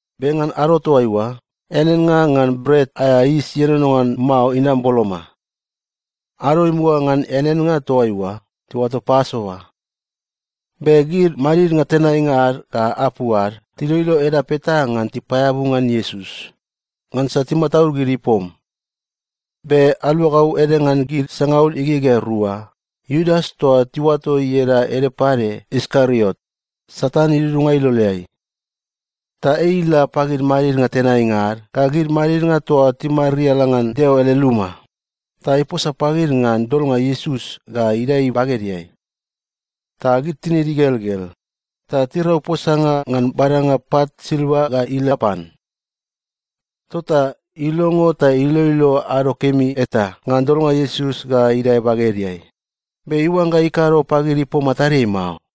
Be ngan ado toaiua, eaneannga ngan Bret aea Yis Ienono ngan Mao inam boloma. Ado imuga ngan eaneannga toa oa tiuato Pasova. Be gid madidnga tenainga ad ga apu ad tiloilo edap eta ngan tipaeabu ngan Iesus, ngansa timataud gid ipom. Be aluagau ede ngan gid sangaul igegea rua, Iudas toa tiuato ieda ede pade Iskariot, Satan idudunga iloleai. Ta ei ila pagid madidnga tenainga ad ga gid madidnga toa timariala ngan Deo ele luma, ta iposa pagid ngan dolnga Iesus ga idae bagedeai. Ta gid tinid igelgel ta tirau posanga ngan badanga pat silva ga ila pan. Tota ilongo ta iloilo ado kemi eta ngan dolnga Iesus ga idae bagedeai, be iuangga ikado pagid ipom matadeai mao.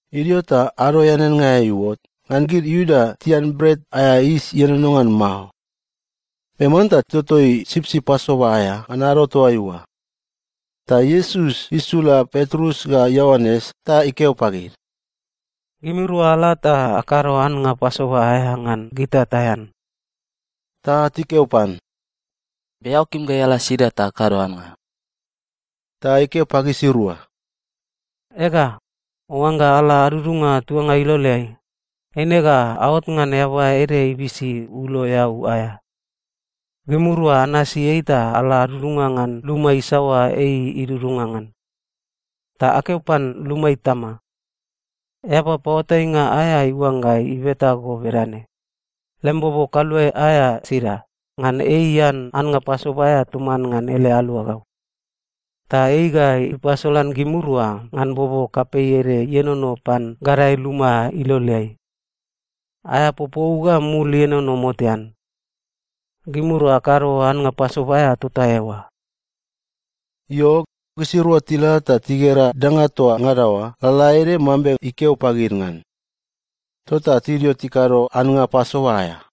Idio ta ado eaneannga aea iuot ngan gid Iuda tian Bret aea Yis Ienono ngan Mao. Be manta titotoi sipsip Pasova aea ngan ado toaiua. Ta Iesus isula Petrus ga Ioanes ta ikeo pagid, “Gimirua ala ta akado annga Pasova aea ngan gita taean.” Ta tikeo pan, “Be eao kim gai ala sida ta akado annga?” Ta ikeo pagisirua, “Ega, oangga ala adudunga tuanga iloleai, eine ga aot ngan eaba ede ibisi ulo eau aea. Gimirua anasi ei ta ala adudunga ngan luma isaoa ei idudunga ngan. Ta akeo pan luma itama, ‘Eaba paoatainga aea iuangga ibeta go bedane: Lem bobo kaluae aea sida, ngan ei ian annga Pasova aea toman ngan ele aluagau?’ Ta ei ga ipasolan gimirua ngan bobo kapei ede ienono pan gadae luma iloleai. Aea popou ga mul ienono motean. Gimirua akado annga Pasova aea tota eoa.” Io, gisirua tila ta tigera danga toa ngada oa lalaede mambe ikeo pagid ngan. Tota tidio tikado annga Pasova aea.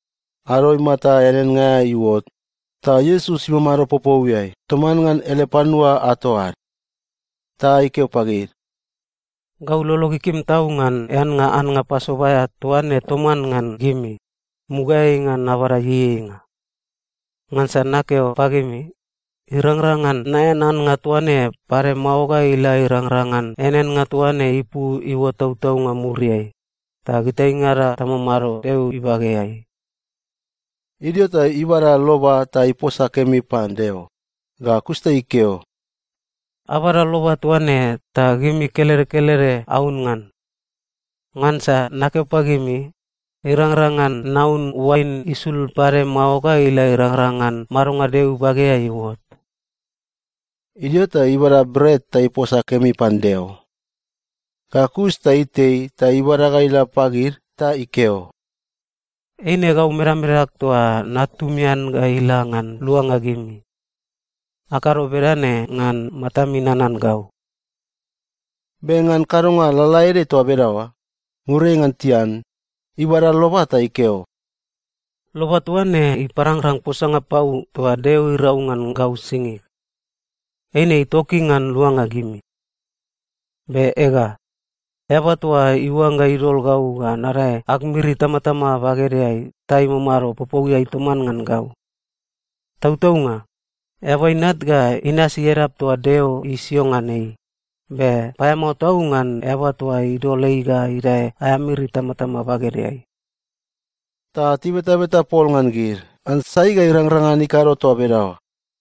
Ado imata eaneannga aea iuot, ta Iesus imamado popouiai toman ngan ele panua ato ad. Ta ikeo pagid, “Gau lolog ikim tau ngan eannga annga Pasova aea toa ne toman ngan gimi, mugaeai ngan nabada ieieinga. Ngansa nakeo pagimi, irangrang ngan naean annga toa ne pade mao ga ila irangrang ngan eaneannga toa ne ipu iuot tautaunga muriai, ta gitaingada tamamado Deo ibageai.” Idio ta ibada loba ta iposa kemi pan Deo, ga kus ta ikeo, “Abada loba toa ne, ta gimi kelede kelede aun ngan. Ngansa nakeo pagimi, irangrang ngan naun oain isul pade mao ga ila irangrang ngan madonga Deo ibageai iuot.” Idio ta ibada bret ta iposa kemi pan Deo. Ga kus ta itei ta ibada ga ila pagid ta ikeo, “Eine gau medamedag toa natumian ga ila ngan luanga gimi. Akado bedane ngan matami nanan gau.” Be ngan kadonga lalaede toa bedaoa, muriai ngan tian, ibada loba ta ikeo, “Loba toa ne iparangrang posanga pau toa Deo irau ngan gau singig. Eine itoki ngan luanga gimi. Be ega, eaba toa iuangga idol gau ga nadae ag miri itamatama bagedeai ta imamado popouiai toman ngan gau. Tautaunga, Eaba Inat ga inasi edap toa Deo isio ngan ei, be paeamao tau ngan eaba toa idol ei ga idae aea miri itamatama bagedeai!” Ta tibetabeta pol ngan gid ngan sai ga irangrang ngan ikado toa bedaoa.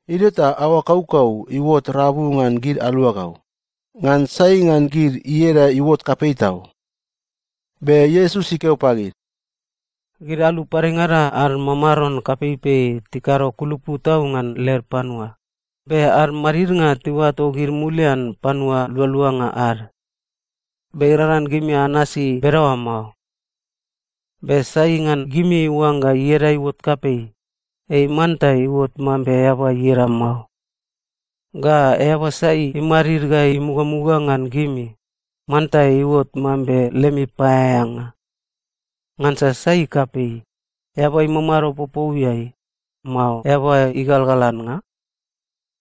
Idio ta aoa kaukau iuot rabu ngan gid aluagau, ngan sai ngan gid ieda iuot kapei tau. Be Iesus ikeo pagid, “Gid alu padengada ad mamaron kapeipei tikado kulupu tau ngan led panua, be ad madidnga tiuato gid mulian panua lualuanga ad. Be irangrang ngan gimi anasi bedaoa mao. Be sai ngan gimi iuangga ieda iuot kapei, ei manta iuot mambe eaba ieda mao. Ga eaba sai imadid ga imugamuga ngan gimi, manta iuot mambe lemi paeaeanga. Ngansa sai kapei, eaba imamado popouiai, mao eaba igalgal annga?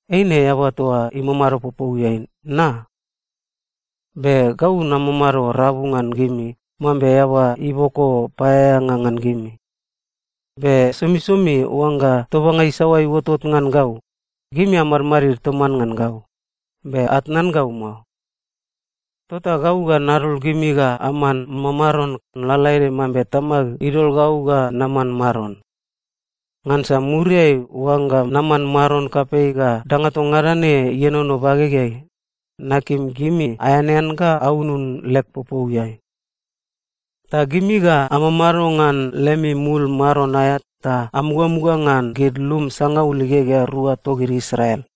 Eine eaba toa imamado popouiai, na? Be gau namamado rabu ngan gimi mambe eaba iboko paeaeanga ngan gimi. Be somisomi oangga tobanga isaoa iuotot ngan gau, gimi amadmadid toman ngan gau, be atnan gau mao. Tota gau ga nadol gimi ga aman mamaron, lalaede mambe Tamag idol gau ga naman maron. Ngansa muriai oangga naman maron kapei ga danga toa ngada ne ienono bagegeai, nakim gimi aeanean ga aunun leg popouiai. Ta gimi ga amamado ngan lemi mul maron aea ta amugamuga ngan gid lum sangaul igegea rua togid Israel.”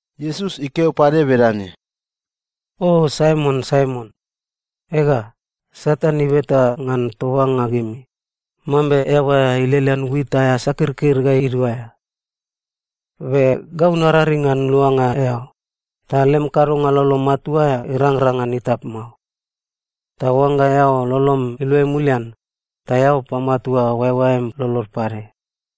Iesus ikeo pade bedane, “O Saimon, Saimon, ega, Satan ibeta ngan tobanga gimi, mambe eaba ilelean wit aea sakirkir ga iduaea. Be gau nararing ngan luanga eao, ta lem kadonga lolo matua aea irangrang ngan itap mao. Ta oangga eao lolom iluai mulian, ta eao pamatua oaeoaem lolod pade.”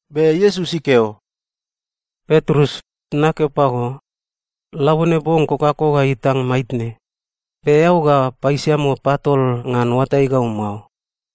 Be Iesus ikeo, “Petrus, nakeo pago, labone bong kokako ga itang maitne, be eao ga paisiamo patol ngan oatai gau mao.”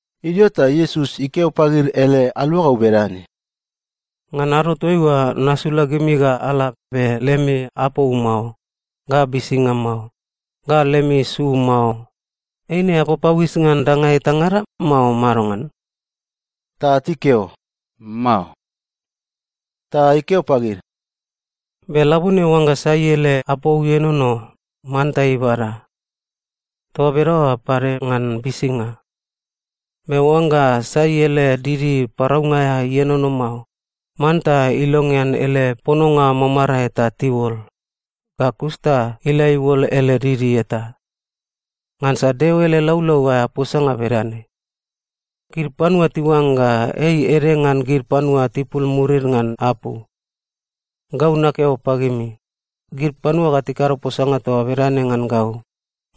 Idio ta Iesus ikeo pagid ele aluagau bedane, “Ngan ado toaiua nasula gimi ga ala be lemi apou mao, ga bisinga mao, ga lemi su mao, eine apapauis ngan danga etangada, mao madongan?” Ta tikeo, “Mao.” Ta ikeo pagid, “Be labone oangga sai ele apou ienono, manta ibada. Toa bedaoa pade ngan bisinga. Be oangga sai ele didi paraunga aea ienono mao, manta ilongean ele pononga mamarae ta tiuol, ga kus ta ila iuol ele didi eta. Ngansa Deo ele laulau aea posanga bedane, ‘Gid panua tiuangga ei ede ngan gid panua tipul murid ngan apu.’ Gau nakeo pagimi, gid panua ga tikado posanga toa bedane ngan gau,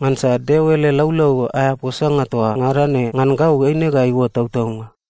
ngansa Deo ele laulau aea posanga toa ngada ne ngan gau eine ga iuot tautaunga.”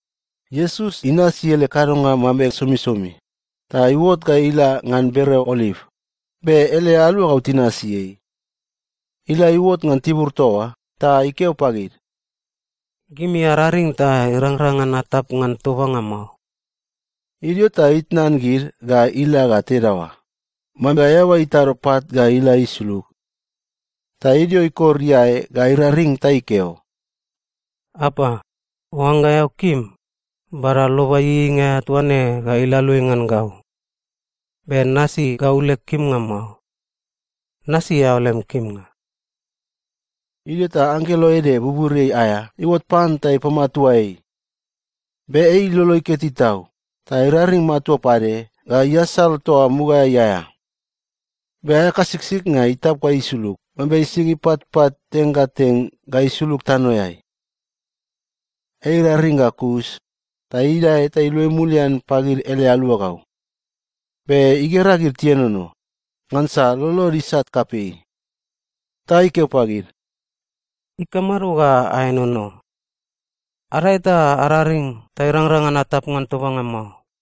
Iesus inasi ele kadonga mambe somisomi ta iuot ga ila ngan bereo Oliv, be ele aluagau tinasi ei. Ila iuot ngan tibur toa oa ta ikeo pagid, “Gimi araring ta irangrang ngan atap ngan tobanga mao.” Idio ta itnan gid ga ila ga tedaoa, mambe eaba itado pat ga ila isulug. Ta idio ikor iae ga iraring ta ikeo, “Apa, oangga eao kim, bada loba ieieinga aea toa ne ga ila aluai ngan gau. Be nasi gau leg kimnga mao. Nasi eao lem kimnga.” Idio ta anggelo ede buburiai aea iuot pan ta ipamatua ei. Be ei ilolo iketi tau ta iraring matua pade ga iasal toa mugaeai aea. Be aea kasiksiknga itap ga isulug mambe sing ipatpat teng ga teng ga isulug tanoeai. Ei iraring ga kus ta idae ta iluai mulian pagid ele aluagau, be igera gid tienono, ngansa lolod isat kapei. Ta ikeo pagid, “Ikamado ga aenono? Adae ta araring ta irangrang ngan atap ngan tobanga mao.”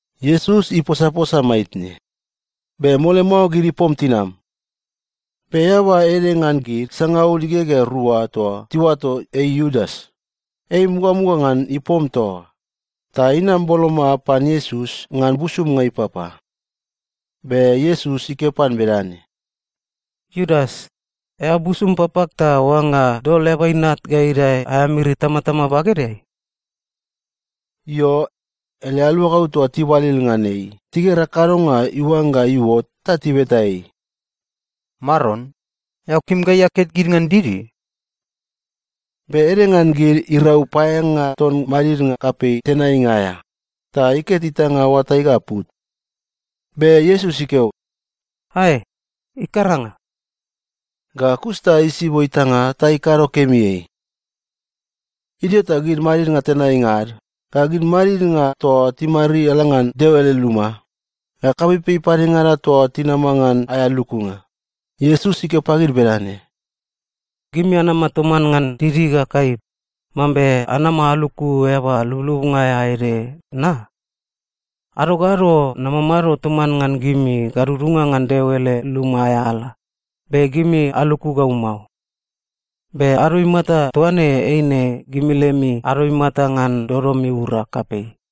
Iesus iposaposa maitne, be mole mao gid ipom tinam. Be eaba ede ngan gid sangaul igegea rua toa tiuato ei Iudas, ei imugamuga ngan ipom toa oa, ta inam boloma pan Iesus ngan busumnga ipapa. Be Iesus ikeo pan bedane, “Iudas, eao busum papag ta oangga dol Eaba Inat ga idae aea miri itamatama bagedeai?” Io, ele aluagau toa tibalil ngan ei tigera kadonga iuangga iuot ta tibeta ei, “Maron, eao kim gai aket gid ngan didi?” Be ede ngan gid irau paeaeanga ton madidnga kapei tenainga aea ta iket itanga oatai ga put. Be Iesus ikeo, “Ae, ikaranga!” Ga kus ta isibo itanga ta ikado kemi ei. Idio ta gid madidnga tenainga ad, ga gid madidnga toa timariala ngan Deo ele luma, ga kapeipei padengada toa tinama ngan aea lukunga, Iesus ikeo pagid bedane, “Gimi anama toman ngan didi ga kaip, mambe anama aluku eaba lublubnga aea ede na? Ado ga ado namamado toman ngan gimi gadudunga ngan Deo ele luma aea ala, be gimi aluku gau mao. Be ado imata toa ne eine gimi lemi ado imata ngan dodom iura kapei.”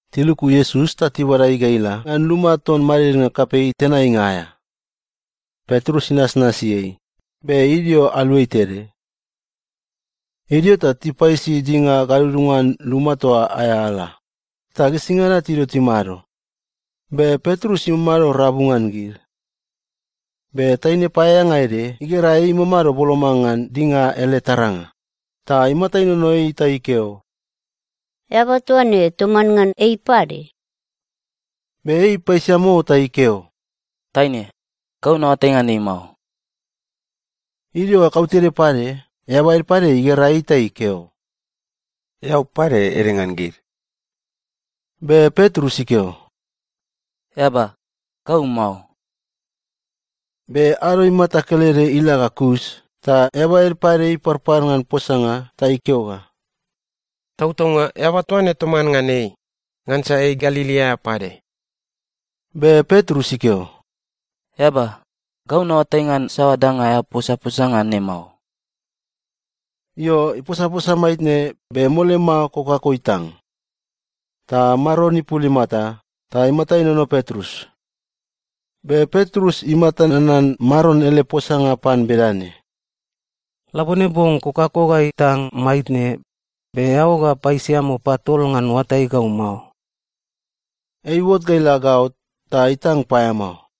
Tiluku Iesus ta tibada ei ga ila ngan luma ton madidnga kapei tenainga aea. Petrus inasnasi ei, be idio aluai tede. Idio ta tipaisi dinga gadudunga ngan luma toa oa aea ala, ta gisingada tidio timado, be Petrus imamado rabu ngan gid. Be taine paeaeanga ede igera ei imamado boloma ngan dinga ele taranga, ta imata inono ei ta ikeo, “Eaba toa ne toman ngan ei pade.” Be ei ipaisiamo ta ikeo, “Taine, gau naoatai ngan ei mao.” Idio ga kautede pade, eaba ede pade igera ei ta ikeo, “Eao pade ede ngan gid.” Be Petrus ikeo, “Eaba, gau mao!” Be ado imata kelede ila ga kus ta eaba ede pade iparpar ngan posanga ta ikeo ga, “Tautaunga eaba toa ne toman ngan ei, ngansa ei Galili aea pade.” Be Petrus ikeo, “Eaba, gau naoatai ngan saoa danga eao posaposa ngan ne mao.” Io, iposaposa maitne, be mole mao kokako itang. Ta Maron ipul imata, ta imata inono Petrus. Be Petrus imata nanan Maron ele posanga pan bedane, “Labone bong kokako ga itang maitne, be eao ga paisiamo patol ngan oatai gau mao.” Ei iuot ga ila gaot ta itang paeamao.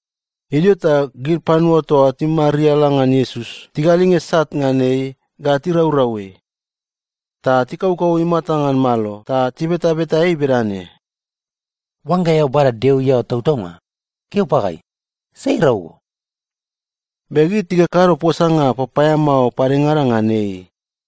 Idio ta gid panua toa timariala ngan Iesus tigalinge sat ngan ei ga tiraurau ei. Ta tikaukau imata ngan malo ta tibetabeta ei bedane, “Oangga eao bada Deo iaoa tautaunga, keo pagai, sai irau go?” Be gid tikakado posanga papaeamao padengada ngan ei.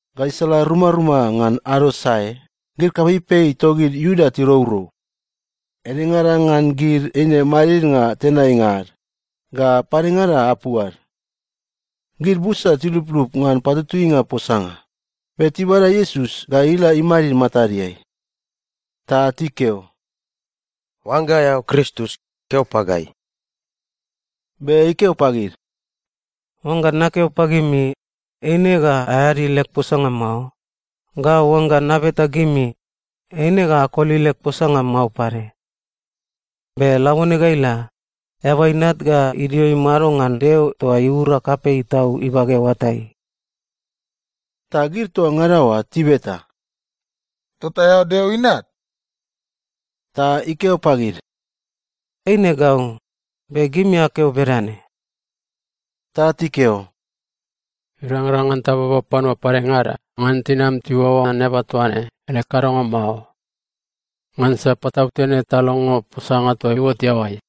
Gaisala rumaruma ngan ado sae, gid kapeipei togid Iuda tirourou. Edengada ngan gid eine madidnga tenainga ad ga padengada apu ad. Gid busa tiluplup ngan patutuinga posanga, be tibada Iesus ga ila imadid matadeai. Ta tikeo, “Oangga eao Kristus, keo pagai.” Be ikeo pagid, “Oangga nakeo pagimi, eine ga aeadi leg posanga mao, ga oangga nabeta gimi, eine ga akoli leg posanga mao pade. Be labone ga ila, Eaba Inat ga idio imado ngan Deo toa iura kapei tau ibage oatai.” Ta gid toa ngada oa tibeta, “Tota eao Deo Inat?” Ta ikeo pagid, “Eine gau, be gimi akeo bedane.” Ta tikeo, “Irangrang ngan tababa panua padengada ngan tinam tiuaoa ngan eaba toa ne ele kadonga mao. Ngansa patautene talongo posanga toa iuot iaoai!”